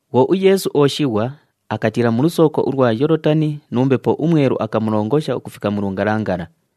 Bhwo uYeesu ooshighwa, akatiila mu lusooko ulwa Yoolotani nu Mbepo uMwelu akamulongosha ukufika mu lungalangala.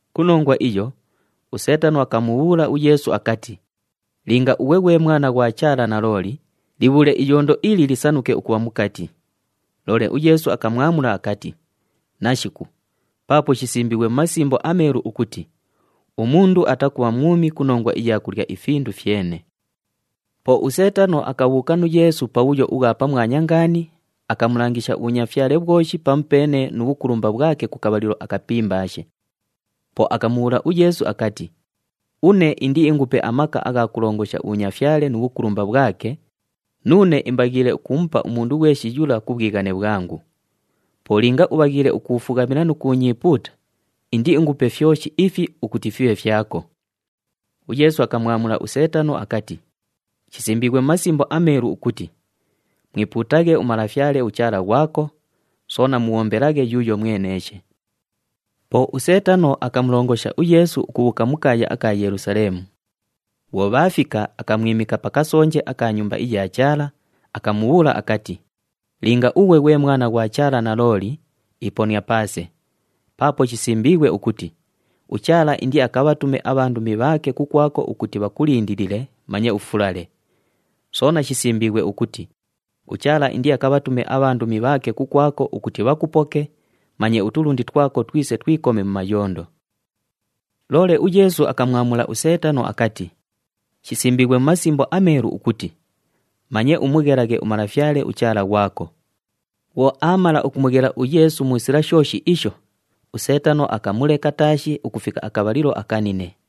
Ku nongwa iyo, uSeetano akamubhuula uYeesu akati, “Linga ughwe ghwe Mwana ghwa Chaala nalooli, libhuule iyondo ili lisanuke ukubha mukati.” Loole uYeesu akamwamula akati, “Nashiku, paapo shisimbiighwe mu Masimbo aMeelu ukuti, ‘Umundu atakubha mwumi ku nongwa iya kulya ifindu fyene.’” Po uSeetano akabhuuka nu Yeesu pabhuyo ubhwa pamwanya ngaani, akamulangisha ubhunyafyale bhwoshi pamupeene nu bhukulumba bhwake ku kabhalilo akapimbaashe. Po akamubhuula uYeesu akati, “Une indiingupe amaka agha kulongosha ubhunyafyale nu bhukulumba bhwake, nuune imbaghiile ukumupa umundu ghweshi yula ku bhwighane bhwangu. Po linga ubhaghiile ukuufughamila nu kuunyiipuuta, indiingupe fyoshi ifi ukuti fibhe fyako.” UYeesu akamwamula uSeetano akati, “Shisimbiighwe mu Masimbo aMeelu ukuti, ‘Mwipuutaghe uMalafyale uChaala ghwako, soona mubhombelaghe yuuyo mweneeshe.’” Po uSeetano akamulongosha uYeesu ukubhuuka mu kaaya aka Yelusaleemu. Bhwo bhaafika, akamwimika pa kasonje aka Nyumba iya Chaala, akamubhuula akati, “Linga ughwe ghwe Mwana ghwa Chaala nalooli, iponia paase, paapo shisimbiighwe ukuti, ‘UChaala indiakabhatume abhandumi bhaake kukwako ukuti bhakulindilile manye ufulale.’ Soona shisimbiighwe ukuti, ‘UChaala indiakabhatume abhandumi bhaake kukwako ukuti bhakupoke, manye utulundi twako twise twikome mu mayondo.’” Loole uYeesu akamwamula uSeetano akati, “Shisimbiighwe mu Masimbo aMeelu ukuti, ‘Manye umughelaghe uMalafyale uChaala ghwako.’” Bhwo aamala ukumughela uYeesu mu sila shooshi isho, uSeetano akamuleka taashi ukufika akabhalilo akanine.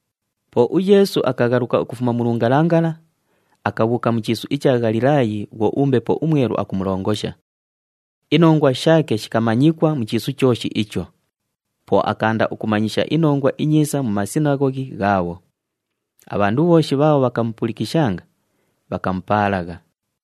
Po uYeesu akaghaluka ukufuma mu lungalangala, akabhuuka mu chiisu icha Ghalilaayi bhwo uMbepo uMwelu akumulongosha. Inongwa shaake shikamanyikwa mu chiisu chooshi icho. Po akaanda ukumanyisha iNongwa iNyiisa mu masinaghoghi ghaabho. Abhandu bhooshi bhaabho bhakamupulikishanga, bhakamupaalagha.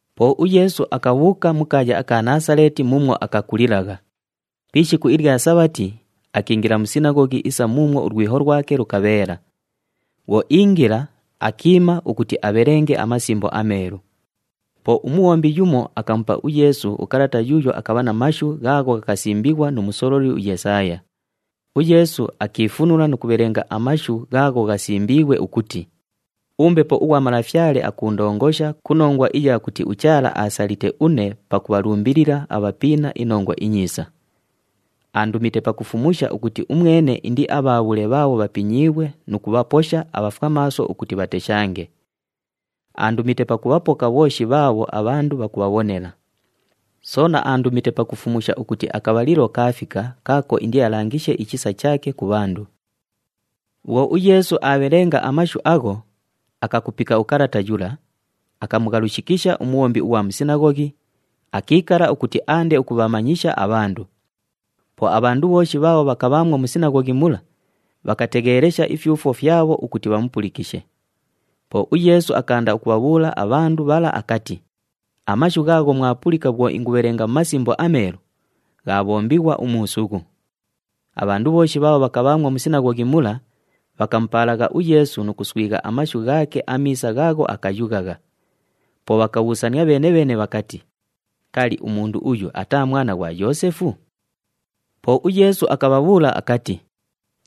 Po uYeesu akabhuuka mu kaaya aka Naasaleeti muumwo akakulilagha. Pi ishiku ilya Sabhati, akiingila mu sinaghoghi isa muumwo ulwiho lwake lukabheela. Bhwo iingila, akiima ukuti abhelenge aMasimbo aMeelu. Po umubhombi yumo akamupa uYeesu ukalata yuuyo akabha na mashu ghaagho ghakasimbighwa nu musololi uYesaaya. UYeesu akiifunula nu kubhelenga amashu ghaagho ghasimbiighwe ukuti, “UMbepo ughwa Malafyale akuundongosha ku nongwa iya kuti uChaala aasalite une pakubhalumbilila abhapiina iNongwa iNyiisa. Aandumite pakufumusha ukuti umwene indiabhaabhule bhaabho bhapinyiighwe nu kubhaposha abhafwamaaso ukuti bhateshange. Aandumite pakubhapoka bhooshi bhaabho abhandu bhakubhabhonela. Soona aandumite pakufumusha ukuti akabhalilo kaafika kaako indialangishe ichisa chaake ku bhandu.” Bhwo uYeesu aabhelenga amashu agho, akakupika ukalata yula, akamughalushikisha umubhombi ughwa mu sinaghoghi, akiikala ukuti aande ukubhamanyisha abhandu. Po abhandu bhooshi bhaabho bhakabhaamwo mu sinaghoghi mula, bhakategheelesha ifyufwo fyabho ukuti bhamupulikishe. Po uYeesu akaanda ukubhabhuula abhandu bhala akati, “Amashu ghaagho mwapulika bhwo ingughabhelenga mu Masimbo aMeelu, ghaabhombighwa umuusughu.” Abhandu bhooshi bhaabho bhakabhaamwo mu sinaghoghi mula, bhakamupaalagha uYeesu nu kughaswigha amashu ghaake amiisa ghaagho akayughagha. Po bhakabhuusania bheene-bheene bhakati, “Kali, umundu uyu ataa mwana ghwa Yoosefu?” Po uYeesu akabhabhuula akati,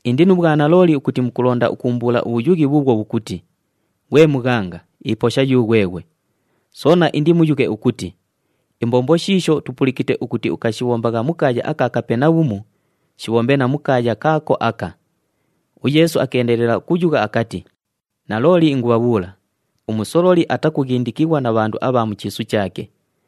“Indi nu bhwanalooli ukuti mukulonda ukuumbuula ubhuyughi bhuubhwo bhukuti, ‘Ghwe mughanga, iposha yughweghwe!’ Soona indimuyughe ukuti, ‘Imbombo shiisho tupulikite ukuti ukashibhombagha mu kaaya aka Kapenabhumu, shibhombe na mu kaaya kaako aka.’” UYeesu akeendelela ukuyugha akati, “Nalooli ingubhabhuula, umusololi atakughindikighwa na bhandu abha mu chiisu chaake.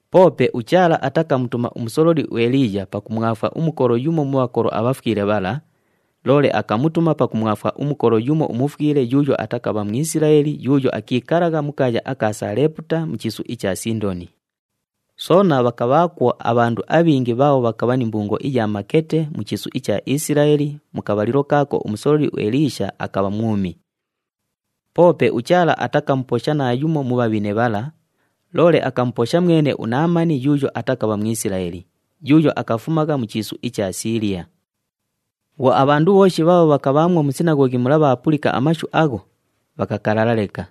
Poope uChaala atakamutuma umusololi uEliiya pakumwafwa umukolo yumo mu bhakolo abhafwile bhala, loole akamutuma pakumwafwa umukolo yumo umufwile yuuyo atakabha Mwisilaeli yuuyo akiikalagha mu kaaya aka Saleeputa, mu chiisu icha Sindoni. Soona bhakabhaakwo abhandu abhingi bhaabho bhakabha ni mbungo iya makete mu chiisu icha Isilaeli mu kabhalilo kaako umusololi uEliisha akabha mwumi. Poope uChaala atakamuposha naayumo mu bhabhine bhala, loole akamuposha mwene uNaamani yuuyo atakabha Mwisilaeli, yuuyo akafumagha mu chiisu icha Siiliya.” Bhwo abhandu bhooshi bhaabho bhakabha mu sinaghoghi mula bhaapulika amashu agho, bhakakalala leka.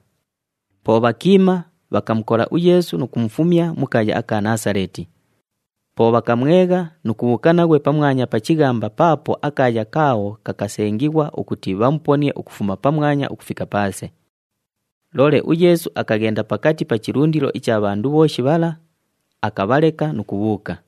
Po bhakiima, bhakamukola uYeesu nu kumufumya mu kaaya aka Naasaleeti. Po bhakamwegha nu kubhuuka naghwe pamwanya pa chighamba paapo akaaya kaabho kakasengighwa ukuti bhamuponie ukufuma pamwanya ukufika paase. Loole uYeesu akaghenda pakati pa chilundilo icha bhandu bhooshi bhala, akabhaleka nu kubhuuka.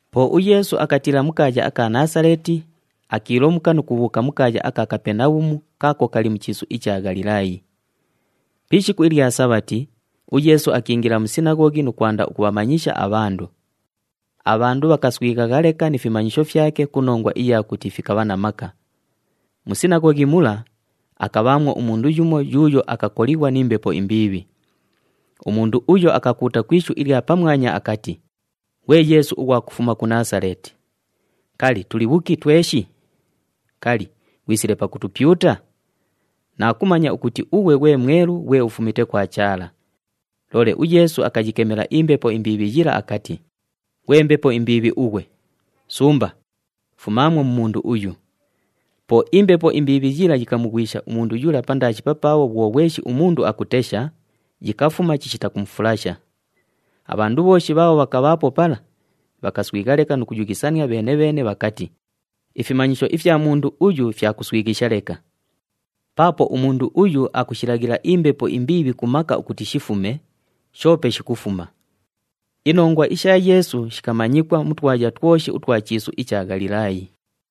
Po uYeesu akatiila mu kaaya aka Naasaleeti, akiilomuka nu kubhuuka mu kaaya aka Kapenabhumu kaako kali mu chiisu icha Ghalilaayi. Pi ishiku ilya Sabhati, uYeesu akiingila mu sinaghoghi nu kwanda ukubhamanyisha abhandu. Abhandu bhakaswighagha leka ni fimanyisho fyake ku nongwa iya kuti fikabha na maka. Mu sinaghoghi mula, akabhaamwo umundu yumo yuuyo akakolighwa ni mbepo imbiibhi. Umundu uyo akakuuta ku ishu ilya pamwanya akati, “Ghwe Yeesu ughwa kufuma ku Naasaleeti! Kali, tuli bhuki tweshi? Kali, ghwisile pakutupyuta? Naakumanya ukuti ughwe ghwe Mwelu ghwe ufumite kwa Chaala.” Loole uYeesu akayikemela imbepo imbiibhi yila akati, “Ghwe mbepo imbiibhi ughwe, sumba! Fumaamwo mu mundu uyu!” Po imbepo imbiibhi yila yikamughwisha umundu yula pandaashi papaabho bhwo ghweshi umundu akutesha, yikafuma chishita kumufulasha. Abhandu bhooshi bhaabho bhakabhaapo pala, bhakaswigha leka nu kuyughisania bheene-bheene bhakati, “Ifimanyisho ifya mundu uyu fya kuswighisha leka! Paapo umundu uyu akushilaghila imbepo imbiibhi ku maka ukuti shifume, shoope shikufuma!” Inongwa isha Yeesu shikamanyikwa mu twaya twoshi utwa chiisu icha Ghalilaayi.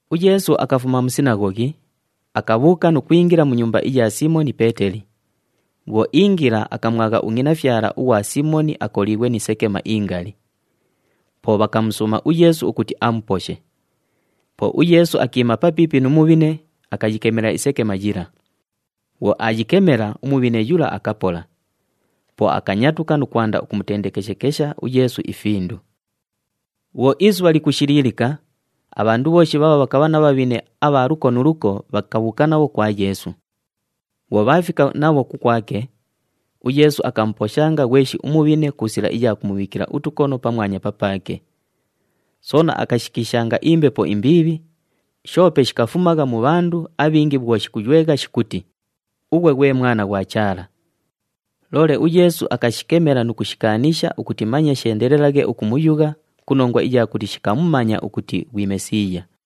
UYeesu akafuma mu sinaghoghi, akabhuuka nu kwingila mu nyumba iya Siimoni Peeteli. Bhwo iingila, akamwagha ungʼinafyala ughwa Siimoni akoliighwe ni sekema ingali. Po bhakamusuuma uYeesu ukuti amuposhe. Po uYeesu akiima papiipi nu mubhine, akayikemela isekema yila. Bhwo aayikemela, umubhine yula akapola. Po akanyatuka nu kwanda ukumutendekeshekesha uYeesu ifindu. Bhwo isubha likushiliilika, abhandu bhooshi bhaabho bhakabha na bhabhine abha luko nu luko, bhakabhuuka nabho kwa Yeesu. Bhwo bhaafika nabho kukwake, uYeesu akamuposhanga ghweshi umubhine ku sila iya kumubhiikila utukono pamwanya papaake. Soona akashikiishanga imbepo imbiibhi, shoope shikafumagha mu bhandu abhingi bhwo shikuywegha shikuti, “Ughwe ghwe Mwana ghwa Chaala!” Loole uYeesu akashikemela nu kushikaanisha ukuti manye sheendelelaghe ukumuyugha ku nongwa iya kuti shikamumanya ukuti ghwi Mesiiya.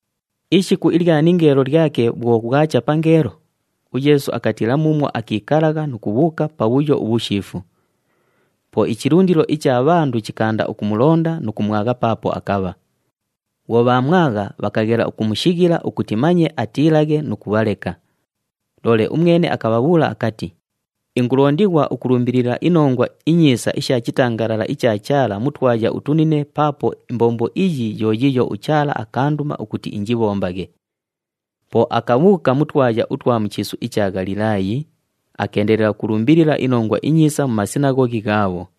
Ishiku ilya ningeelo lyake bhwo bhwacha pangeelo, uYeesu akatiila muumwo akiikalagha nu kubhuuka pabhuyo ubhushiifu. Po ichilundilo icha bhandu chikaanda ukumulonda nu kumwagha paapo akabha. Bhwo bhaamwagha, bhakaghela ukumushighila ukuti manye atiilaghe nu kubhaleka. Loole umwene akabhabhuula akati, “Ingulondighwa ukulumbilila iNongwa iNyiisa isha chitangalala icha Chaala mu twaya utunine paapo imbombo iyi yo yiiyo uChaala akaanduma ukuti injibhombaghe.” Po akabhuuka mu twaya utwa mu chiisu icha Ghalilaayi, akeendelela ukulumbilila iNongwa iNyiisa mu masinaghoghi ghaabho.